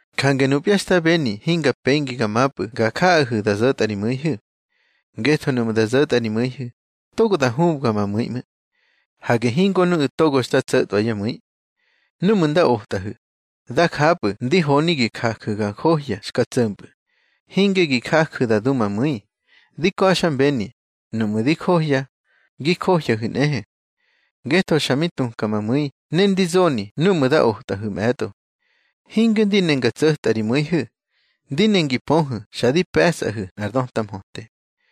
Jange nupya xta beni hinga pengi ga mapꞌu̱ ga jaꞌahu̱ da zo̱tꞌa ri mu̱ihu̱. Ngetho nuꞌmu̱ da zo̱tꞌa ri mu̱ihu̱, togo da hubga ma mu̱i ꞌmu̱. Hage hingo nuꞌu̱ togo xta tso̱tꞌwa yá mu̱i. Núꞌmu̱ nda otꞌahu̱, da japꞌu̱ ndi honi gi jaju̱ ga njohya xka tso̱mpꞌu̱, hinge gi jaju̱ da du ma mu̱i. Di ka̱xmbeni, nuꞌmu̱ di johya, gi johyahu̱ nꞌehe. Ngetho xa mi tuka ma mu̱i ne ndi zoni núꞌmu̱ da otꞌahu̱ mꞌe̱tꞌo. Hinge ndi ne nga tso̱tꞌa ri mu̱ihu̱, ndi ne ngi pöhu̱ xa di pe̱sꞌahu̱ nꞌar döta mhöte.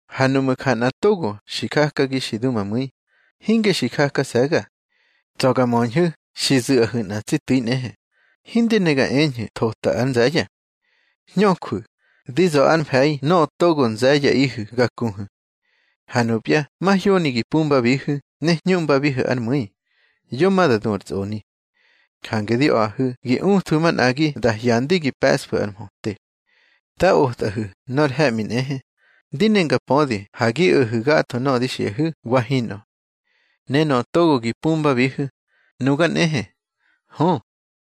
Ha nuꞌmu̱ ja nꞌa togo xi jakagi xi du ma mu̱i, hinge xi jakase̱ga. Tsa̱ ga möñhu̱ xi zu̱ꞌahu̱ nꞌa tsi tu̱i nꞌehe, hindi ne ga eñhu̱ thota ár nze̱ye̱. Hñöjwu̱, di za̱ ár mfe̱i nöꞌö togo nze̱ye̱ꞌihu̱ ga kuhu̱. Ha nupya mahyoni gi pumbabihu̱ ne hñuꞌmbabi ár mu̱i, yo ma da du ar tsꞌoni. Jange di a̱ꞌahu̱ gi uthwu̱ manꞌagi da hyandi gi pe̱ꞌsfu̱ ar mhöte. Da otꞌahu̱ nor he̱ꞌmi nꞌehe, ndi ne nga pödi ha gi o̱hu̱ gatho nöꞌö di xiꞌahu̱, wa hinꞌö. Ne nöꞌö togo gi pumbabihu̱, nuga nꞌehe. Hö,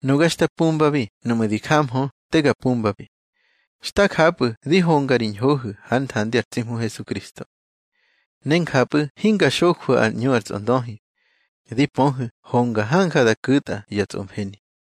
nuga xta pumbabi nuꞌmu̱ di jamhö te ga pumbabi. Xta japꞌu̱ di honga ri ñhohu̱ hár nthandi ar tsi Hmu Hesukristo. Ne njapꞌu̱ hinga xojwu̱ ar ꞌñu ar tsꞌondöhi. Di pöhu̱ honga hanja da ku̱tꞌa ya tsꞌomfeni.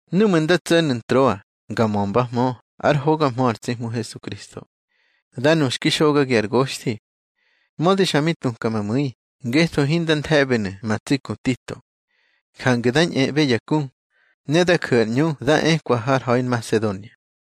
Núꞌmu̱ nda tso̱nu̱ Ntroa nga mömbahmö ár hoga mhö ar tsi Hmu Hesukristo, da nu xki xogagi ar goxthi. Mödi xa mi tuka ma mu̱i, ngetho hinda nthe̱ꞌbenu̱ ma tsi ku Tito. Jange da ñꞌeꞌbe ya ku, ne da ju̱ ar ꞌñu da ekwa har ha̱i Nmasedonia.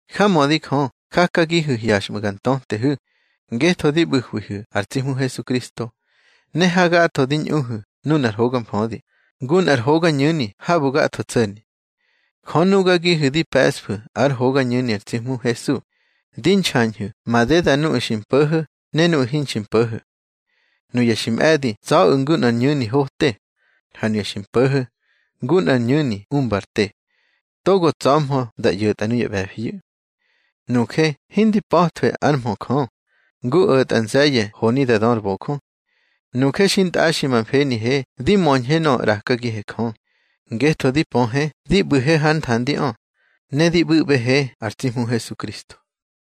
Jamödi Jö jakagihu̱ hyaxꞌmu̱ ga ntötehu̱, ngetho di ꞌbu̱hwihu̱ ar tsi Hmu Hesukristo. Ne hagatho di ñꞌuhu̱ nunar hoga mfödi, ngu nꞌar hogañu̱ni habu̱ gatho tso̱ni. Jö nugagihu̱ di pe̱ꞌsfu̱ ár hogañu̱ni ar tsi Hmu Hesu, di nxañhu̱ madeda nuꞌu̱ xi mpo̱ho̱ ne nuꞌu̱ hinxi mpo̱ho̱. Nuya xi mꞌe̱di tsa̱ꞌu̱ ngu nꞌar ñu̱ni hote, ha nuya xi mpo̱ho̱, ngu nꞌar ñu̱ni umba ar te. Togo tsa̱hmö da ꞌyo̱tꞌa nuya ꞌbe̱fiyu̱. Nuje hindi pa̱thwe ár mhö Jö, ngu o̱tꞌa nze̱ye̱ honi da dö ar bojö. Nuje xintꞌaxi ma mfenihe di möñhe nöꞌö ꞌrakagihe Jö, ngetho di pöhe di ꞌbu̱he hár nthandiꞌö, ne di ꞌbu̱ꞌbehe ar tsi Hmu Hesukristo.